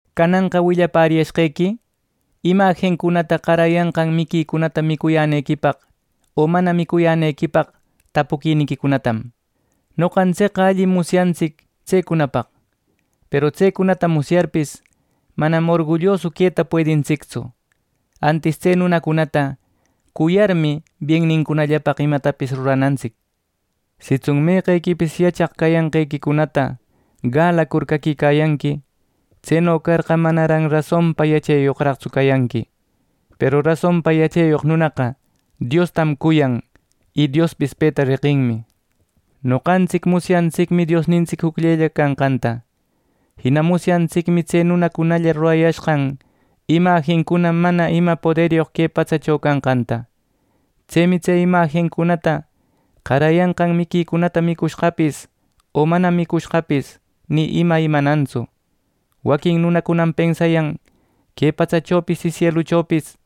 Cananqa willapäriyashqequi imajincunata qarayanqan miquicunata micuyänequipaq o mana micuyänequipaq tapuquiniquicunatam. Noqantsicqa allim musyantsic tsecunapaq. Peru tsecunata musyarpis, manam orgullosu queta puedintsictsu. Antis tse nunacunata cuyarmi, biennincunallapaq imatapis ruranantsic. Sitsun meqequipis yachaq cayanqequicunata galacur caquicayanqui; tseno carqa, manaran rasonpa yacheyoqraqtsu cayanqui. Peru rasonpa yacheyoq nunaqa Diostam cuyan, y Diospis peta reqinmi. Noqantsic musyantsicmi Diosnintsic jucllella canqanta. Jina musyantsicmi tse nunacunalla rurayashqan imajincuna mana ima poderyoq que patsacho canqanta. Tsemi tse imajincunata qarayanqan miquicunata micucushqapis o mana micushqapis ni ima imanantsu. Waquin nunacunam pensayan que patsachopis y sieluchopis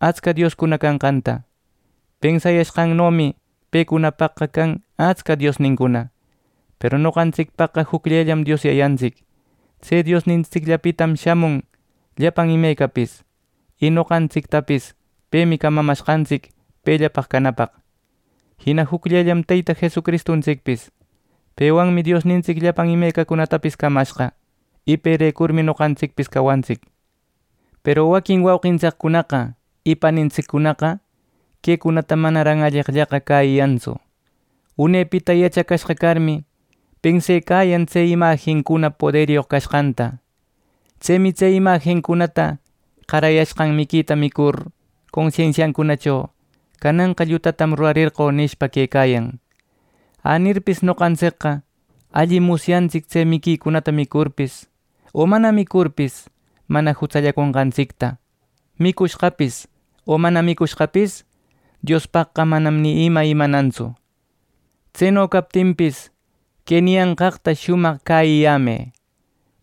atsca dioscuna canqanta. ˻Pensayashqannomi pecunapaqqa can atsca diosnincuna.˼ Peru noqantsicpaqqa jucllellam Dios Yayantsic. Tse Diosnintsicllapitam shamun llapan imecapis, y noqantsictapis pemi camamashqantsic pellapaq canapaq. Jina jucllellam Teyta Jesucristuntsicpis. Pewanmi Diosnintsic llapan imecacunatapis camashqa, y perecurmi noqantsicpis cawantsic. Peru waquin wauqintsiccunaqa y panintsiccunaqa quecunata manaran alleqllaqa cäyiyantsu. Unepita yachacashqa carmi, pensecayan tse imajincuna poderyoq cashqanta. Tsemi tse imajincunata qarayashqan miquita micurcur consensiacunacho “Cananqa llutatam rurarerqö” nishpa, quecayan. Änirpis noqantsicqa allim musyantsic tse miquicunata micurpis o mana micurpis mana jutsallaconqantsicta. Micushqapis o mana micushqapis Diospaqqa manam ni ima imanantsu. Tseno captinpis, que niyanqaqta shumaq cäyiyämë: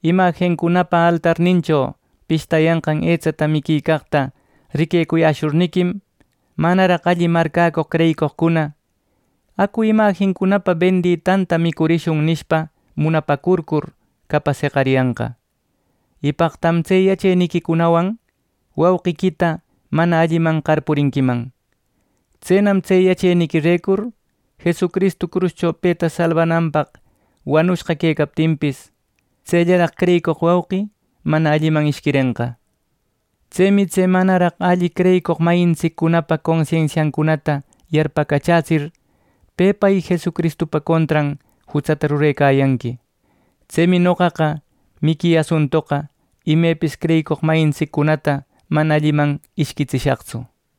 Imajincunapa altarnincho pishtayanqan etsata miquicaqta riquecuyäshurniquim, manaraq alli marcäcoq creyicoqcuna “Acu imajincunapa benditanta micurishun” nishpa, munapäcurcur capas jeqariyanqa; y paqtam tse yacheniquiwan wauqiquita mana alliman qarpurinquiman. Tsenam tse yacheniquirecur Jesucristu cruscho peta salbananpaq wanushqa quecaptinpis, tsellaraq creyicoq wauqi mana alliman ishquirenqa. Tsemi tse manaraq alli creyicoq mayintsiccunapa consensiancunata yarpacachätsir pepa y Jesucristupa contran jutsata rurecayanqui. Tsemi noqaqa miqui asuntoqa imepis creyicoq mayintsiccunata mana alliman ishquitsishaqtsu.